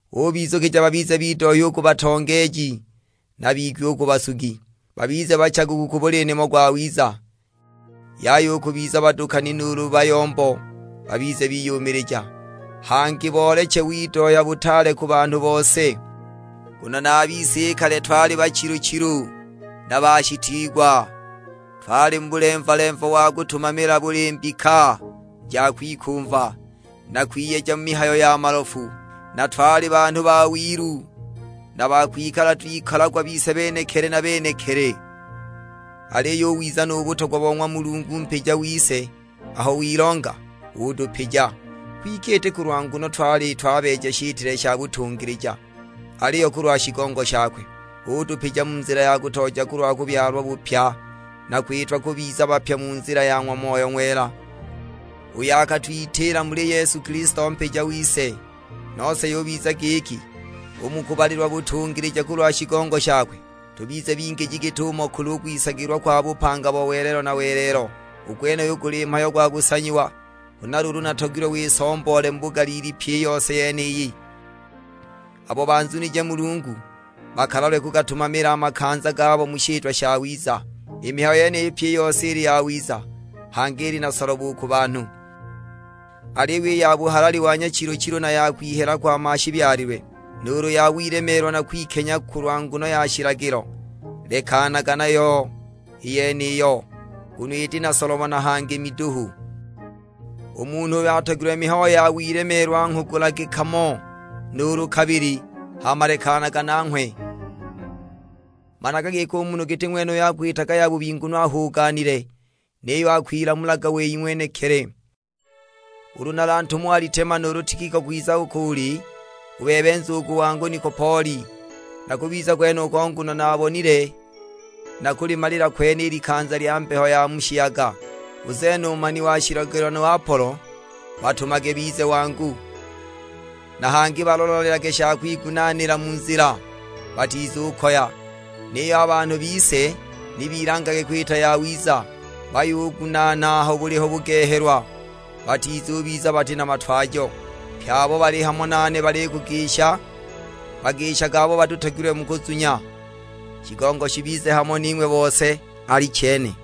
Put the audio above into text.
Ubizukija babize bidohya u ku batongeeji, na bigwi u ku basugi; babize bachaguku ku buli nimo gwawiza. Yaya u kubiza badukani nuulu bayombo; babize biyumilija, hangi booleche widohya butaale ku banhu bose. Nguno na a bise i kale twali bachilu-chilu, na bashitiigwa. Twali mu bulemva-lemva wa kutumamila buli mbika ja kwikumva, na kwiyeja mu mihayo ya malofu. Na twali banhu ba wilu na ba kwikala twikolagwa bise benekili na benekili. Aliyo u wiza nu butogwa bo ng'wa Mulungu Mpija wise aho wilonga, utupija. Kwike iti kulwa nguno twali twabeeja shitile sha butungilija, aliyo kulwa shigongo shakwe. Utupija mu nzila ya kutooja kulwa kubyalwa bupya, na kwitwa kubiza bapya mu nzila ya ng'wa Moyo Ng'wela, uyo akatwitiila muli Yesu Kilisto Mpija wise. Nose yubiza giki, u mu kubalilwa butungilija kulwa shigongo shakwe, tubize bingiji git'umo kuli u kwisagilwa kwa bupanga bo welelo na welelo. U gwenuyu guli mhayo gwa kusanyiwa. Huna luulu natogilwe wisomboole mu bugaliili pyi i yose yeniyi, abo banzunije Mulungu bakalalwe kugatumamila a makanza gabo mu shitwa shawiza. I mihayo yeniyi pyi i yose ili yawiza, hangi ili na solobo u ku banhu. Aliyo i ya buhalali wa nyachilu-chilu na ya kwihela kwa mashibyalilwe, nuulu ya wilemeelwa na kwikenya kulwa nguno ya shilagilo, lekanaga nayo i yeniyo, nguno iti na solobo na hangi miduhu. U munhu uyo atogilwe mihayo ya wilemeelwa nghugulage kamo nuulu kabili, hama lekanaga nanghwe! Managa giki u munhu giti ng'wenuyo akwitaga yabubi nguno ahuganile, niyo akwilamulaga wei ng'wenekili. Ulu nalantume Alitema nuulu Tikiko kwiza uko uli, u bebe nzugu wangu Nikopoli; nakubiza kwenuko nguno naabonile nakulimalila kwene i likanza lya mbeho ya mu shiyaga. U Zena u mani wa shilagilo nu Apolo, batumage bize wangu, na hangi balola-lolelage sha kwigunaanila mu nzila, batizukoya. Niyo a banhu bise ni bilangage kwita yawiza, bayugunaana aho buliho bugehelwa, batizubiza bati na matwajo. Pye abo bali hamo nane balikugisha. Bagishage abo batutogilwe mu kuzunya. Shigongo shibize hamo ning'we bose: Alichene.